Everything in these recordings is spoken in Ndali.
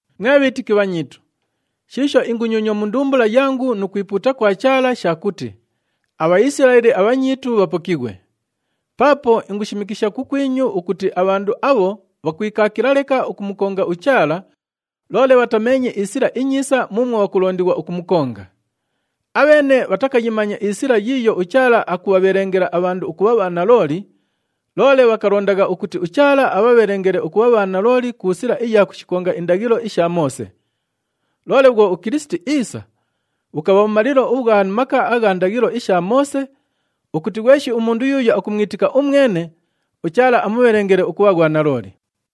Mwe bhiitiki bhanyiitu! Shiisho ingunyonywa mu ndumbula yangu nu kwipuuta kwa Chaala sha kuti aBhaisilaeli abhanyiitu bhapokighwe. Paapo ingushimikisha kukwinyu ukuti abhandu abho bhakwikaakila leka ukumukonga uChaala, loole bhatameenye isila inyiisa muumwo bhakulondighwa ukumukonga. Abheene bhatakayimanya isila yiiyo uChaala akubhabhelengela abhandu ukubha bhanalooli, loole bhakalondagha ukuti uChaala abhabhelengele ukubha bhanalooli ku sila iya kushikonga indaghilo isha Moose. Loole bhwo uKilisiti iisa, bhukabha bhumalilo ubhwa maka agha ndaghilo isha Moose, ukuti ghweshi umundu yuuyo akumwitika umwene, uChaala amubhelengele ukubha ghwanalooli.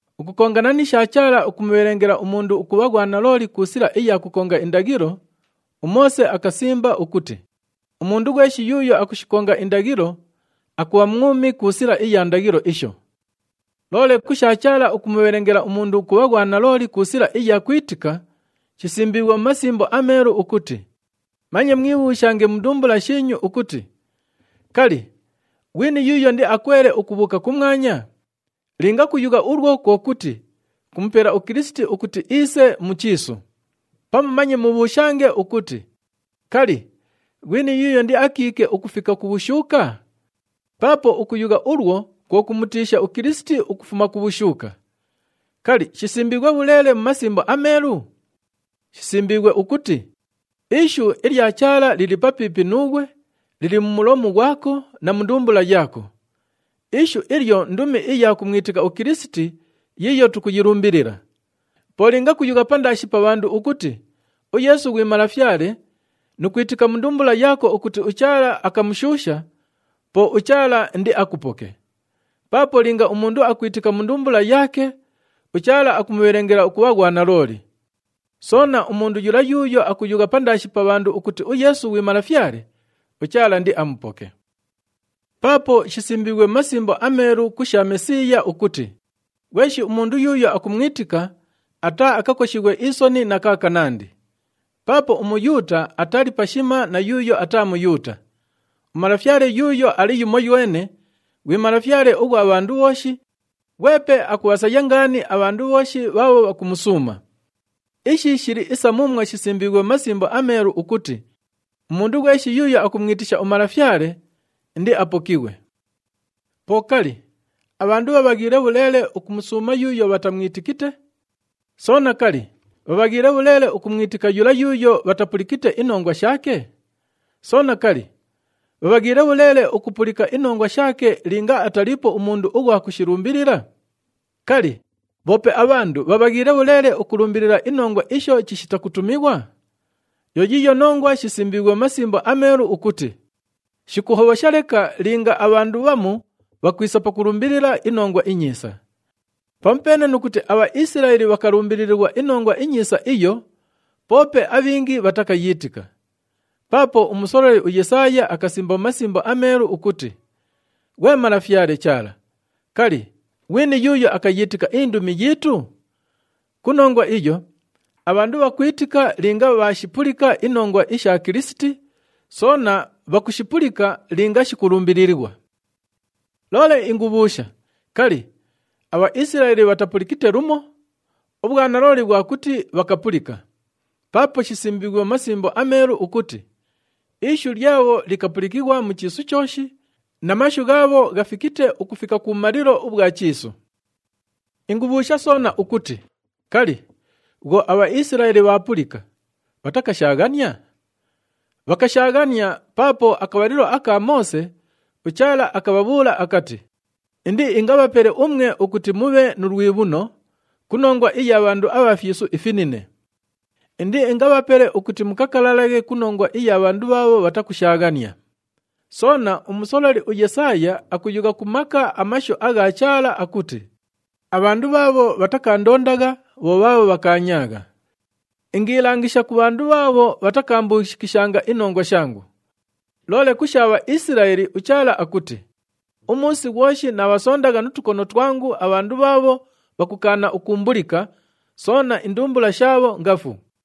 Ukukongana ni sha Chaala ukumubhelengela umundu ukubha ghwanalooli ku sila iya kukonga indaghilo, uMoose akasimba ukuti, “Umundu ghweshi yuuyo akushikonga indaghilo, akubha mwumi ku sila iya indaghilo isho.” Loole ku sha Chaala ukumubhelengela umundu ukubha ghwanalooli ku sila iya kwitika, shisimbiighwe mu Masimbo aMeelu ukuti, “Manye mwibhuushange mu ndumbula shiinyu ukuti, ‘Kali, ghwini yuuyo indiakwele ukubhuuka kumwanya?’” Linga kuyugha ulwo kwo kuti, kumupela uKilisiti ukuti iise mu chiisu. “Pamu manye mubhuushange ukuti, ‘Kali, ghwini yuuyo indiakiike ukufika ku bhushuuka?’” Paapo ukuyugha ulwo kwo kumutiisha uKilisiti ukufuma ku bhushuuka. Kali, shisimbiighwe bhuleele mu Masimbo aMeelu? Shisimbiighwe ukuti, “Ishu ilya Chaala lili papiipi nuughwe, lili mu mulomu ghwako na mu ndumbula yaako.” Ishu ilyo ndumi iya kumwitika uKilisiti yiiyo tukuyilumbilila. Po linga kuyugha pandaashi pa bhandu ukuti, “UYeesu ghwi Malafyale,” nu kwitika mu ndumbula yaako ukuti uChaala akamushuusha, po uChaala indiakupoke. Paapo linga umundu akwitika mu ndumbula yaake, uChaala akumubhelengela ukubha ghwanalooli. Soona, umundu yula yuuyo akuyugha pandaashi pa bhandu ukuti uYeesu ghwi Malafyale, uChaala indiamupoke. Paapo shisimbiighwe mu Masimbo aMeelu ku sha Mesiiya ukuti, “Ghweshi umundu yuuyo akumwitika, ataaakakoshighwe isoni na kaakanandi.” Paapo uMuyuuta atali pashima na yuuyo ataa Muyuuta. UMalafyale yuuyo ali yumoywene, ghwi Malafyale ughwa bhandu bhooshi, ghwepe akubhasaya ngaani abhandu bhooshi bhaabho bhakumusuuma. Ishi shili isa muumwo shisimbiighwe mu Masimbo aMeelu ukuti, “Umundu ghweshi yuuyo akumwitisha uMalafyale, indiapokighwe.” Po kali, abhandu bhabhaghiile bhuleele ukumusuuma yuuyo bhatamwitikite? Soona, kali, bhabhaghiile bhuleele ukumwitika yula yuuyo bhatapulikite inongwa shaake? Soona, kali, bhabhaghiile bhuleele ukupulika inongwa shaake linga ataliipo umundu ughwa kushilumbilila? Kali, bhoope abhandu bhabhaghiile bhuleele ukulumbilila inongwa isho chishita kutumighwa? Yo yiiyo nongwa shisimbiighwe mu Masimbo aMeelu ukuti, “Shikuhobhosha leka linga abhandu bhamu bhakwisa pakulumbilila inongwa inyiisa!” Pamupeene nu kuti aBhaisilaeli bhakalumbililighwa iNongwa iNyiisa iyo, poope abhingi bhatakayiitika. Paapo umusololi uYesaaya akasimba mu Masimbo aMeelu ukuti, “Ghwe Malafyale Chaala, kali, ghwini yuuyo akayiitika indumi yiitu?” Ku nongwa iyo, abhandu bhakwitika linga bhaashipulika inongwa isha Kilisiti, soona bhakushipulika linga shikulumbililighwa. Loole ingubhuusha, “Kali, aBhaisilaeli bhatapulikite lumo?” Ubhwanalooli bhwa kuti, bhakapulika. Paapo shisimbiighwe mu Masimbo aMeelu ukuti, “Ishu lyabho likapulikighwa mu chiisu chooshi, na mashu ghaabho ghafikite ukufika kubhumalilo ubhwa chiisu.” Ingubhuusha soona ukuti, “Kali, bhwo aBhaisilaeli bhaapulika, bhatakashaaghania?” Bhakashaaghania, paapo akabhalilo aka Moose, uChaala akabhabhuula akati, “Indiingabhapele umwe ukuti mubhe nu lwibhuno ku nongwa iya bhandu abha fyisu ifinine. Indiingabhapele ukuti mukakalalaghe ku nongwa iya bhandu bhaabho bhatakushaaghania.” Soona, umusololi uYesaaya akuyugha ku maka amashu agha Chaala akuti, “Abhandu bhaabho bhatakaandondagha, bho bhaabho bhakaanyaagha. Ingiilangisha ku bhandu bhaabho bhatakaambuushikishanga inongwa shangu.” Loole ku sha Bhaisilaeli, uChaala akuti, “Umuusi ghwoshi naabhasondagha nu tukono twangu abhandu bhaabho bhakukaana ukuumbulika, soona indumbula shaabho ngafu.”